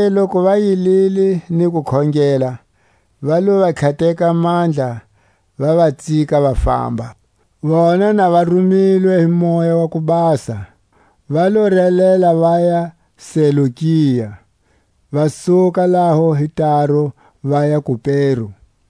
Zonake loku va yilile ni ku khongela, va lo va tlhateka mandla, va va tsika va famba. Barnabasi na Saule le Kupero. Vona na va rumilwe hi Moya wa ku Basa, va lo relela vaya Selukia; va suka laho hi taru vaya Kupero.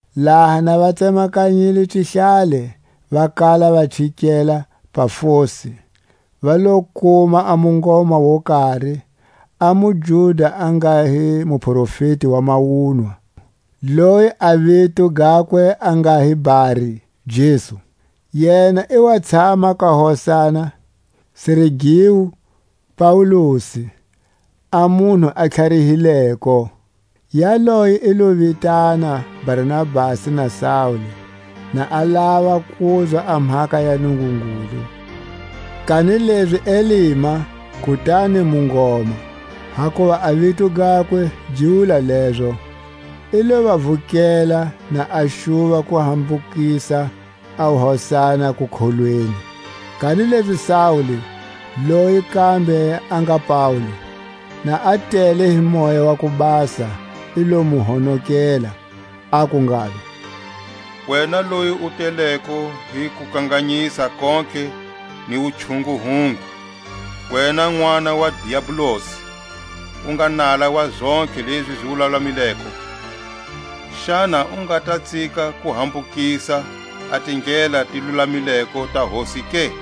Laha na va tsemakanyile xihlale va kala va chikela Pafosi, va lo kuma a mungoma wo kari, a muJuda a nga hi muprofeti wa mawunwa, loyi a vito gakwe a nga hi Bar-Jesu. Yena i wa tshama ka hosana Sergiu Paulusi, a munhu a tlharihileko. Yaloye i lo vitana Barnabasi na Saule, na a lava kuzwa a mhaka ya Nungungulu. Kanilezi Elima, (kutani Mungoma, hakuva a vito gakwe gi wula lezo,) i lo va vukela, na a xuva ku hambukisa a hosana kukholweni. Kanilezi Saule, loyi kambe a nga Paule, na a tele hi Moya wa ku Basa, i lo mu honokela, aku ngalo: Wena loyi u teleko hi kukanganyisa kontlhe ni wuchunguhungu, wena nʼwana wa Diabolus, u nga nala wa zontlhe lezi zi lulamileko, xana u nga ta tsika ku hambukisa a tindlela ti lulamileko ta Hosi ke?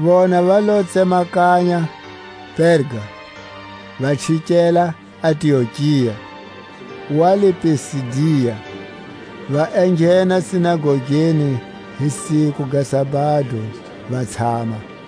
Vona va lo tsemakanya Perga, va chikela Antiokia wa le Pisidia; va enghena sinagogeni hi siku ga sabado, va tshama.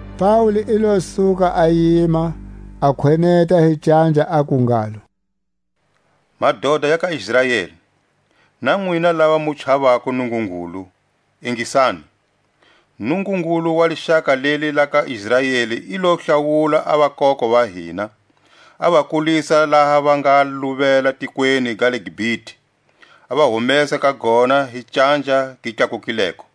Paule i lo suka a yima, a khweneta hi canja, aku ngalo: Madota ya ka Israeli, na nwina lava mu chavako Nungungulu, ingisani. Nungungulu wa lixaka leli la ka Israeli i lo hlawula a vakoko va hina, a va kulisa laha va nga luvele tikweni ga le Gipite, a va humesa ka gona hi canja gi tlakukileko,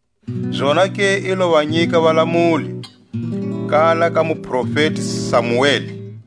Zonake i lo va nyika Valamuli, kala ka muprofeti Samueli.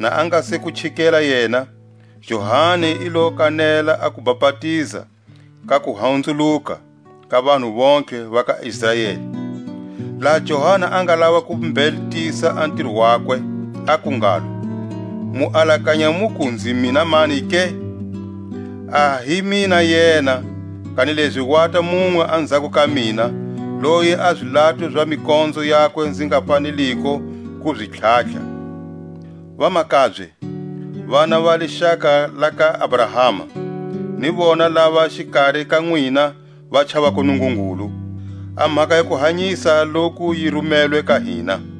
Na a nga se ku chikela yena, Johani i lo kanela a kubapatiza ka kuhunzuluka ka vanhu vontlhe va ka Israeli. Laha Johani a nga lava ku mbhetisa a ntiro wakwe, aku ngalo: Mu alakanya muku nzi mina mani ke? A hi mina yena. Kanilezi wata munwe anzhako ka mina, loyi a zilato za mikonzo yakwe nzi nga faneliko ku zi tlhatlha. Vamakabye, vana va lixaka la ka Abrahama, ni vona lava xikari ka nwina va chavako Nungungulu, a mhaka ya kuhanyisa loku yi rumelwe ka hina.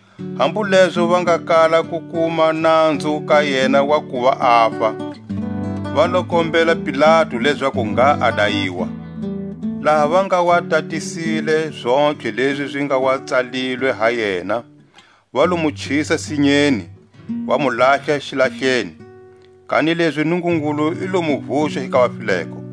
Hambu lezo va nga kala ku kuma nanzu ka yena wa kuva afa, va lo kombela Pilatu lezaku ngha a dayiwa. Laha va nga wa tatisile zontlhe lezi zi nga wa tsalilwe ha yena, va lo mu chisa sinyeni, va mu lahla xilahleni. Kanilezi Nungungulu i lo mu vuxa hi ka vafileko;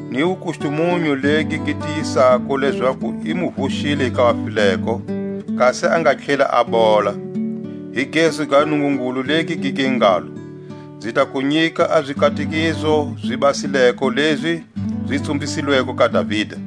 Ni wukustumunyu legi gi tiyisako lezaku i mu vuxile hi ka vafileko, kasi a nga tlheli a bola, hi gezu ga Nungungulu legi gi nge ngalo: Nzi ta ku nyika a zikatekiso zi basileko lezi zi tsumbisilweko ka Davida.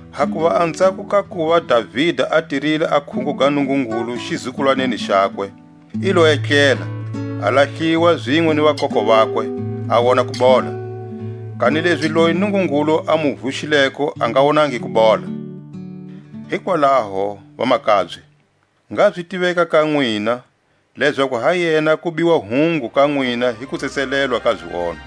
Hakuva anzhako ka kuva Davida a tirile a khungo ga Nungungulu xizukulwaneni xakwe, i lo etlela, a lahliwa zinwe ni vakoko vakwe, a wona kubola; kanilezi loyi Nungungulu a mu vuxileko a nga wonangi kubola. Hikwalaho, vamakabye, ngha zi tiveka ka nwina, lezaku ha yena ku biwa hungu ka nwina hi kutsetselelwa ka zionho.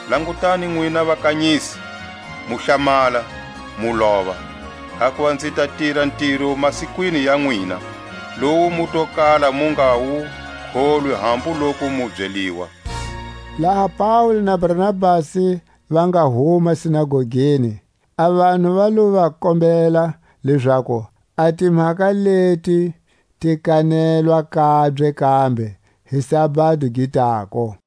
Langutani nwina vakanyisi, mu hlamala, mu lova; Hakuva nzi ta tira ntiro masikwini ya nwina, Lowu mu to kala mu nga wu kholwi hambu loku mu byeliwa, Laha Paule na Barnabasi va nga huma sinagogeni, a vanhu va lo va kombela lezaku a timhaka leti ti kanelwa kabye kambe hi sabado gi tako.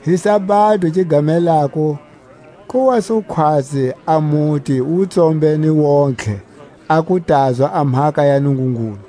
Hi sabado gi gamelako ku wa su khwatsi a muti wu tsombene wontihe a ku tazwa a mhaka ya Nungungulu.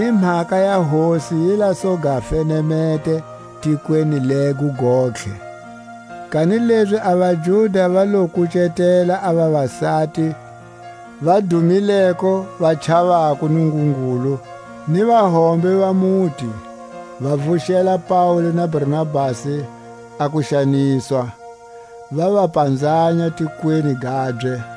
Ni mhaka ya Hosi yi la su ga fenemete tikweni lego gontlhe. Kanilezi a vaJuda va lo kucetela a vavasati va dumileko va chavako Nungungulu, ni vahombe va muti, va vuxela Paule na Barnabasi a kuxaniswa, va va panzanya tikweni gabye.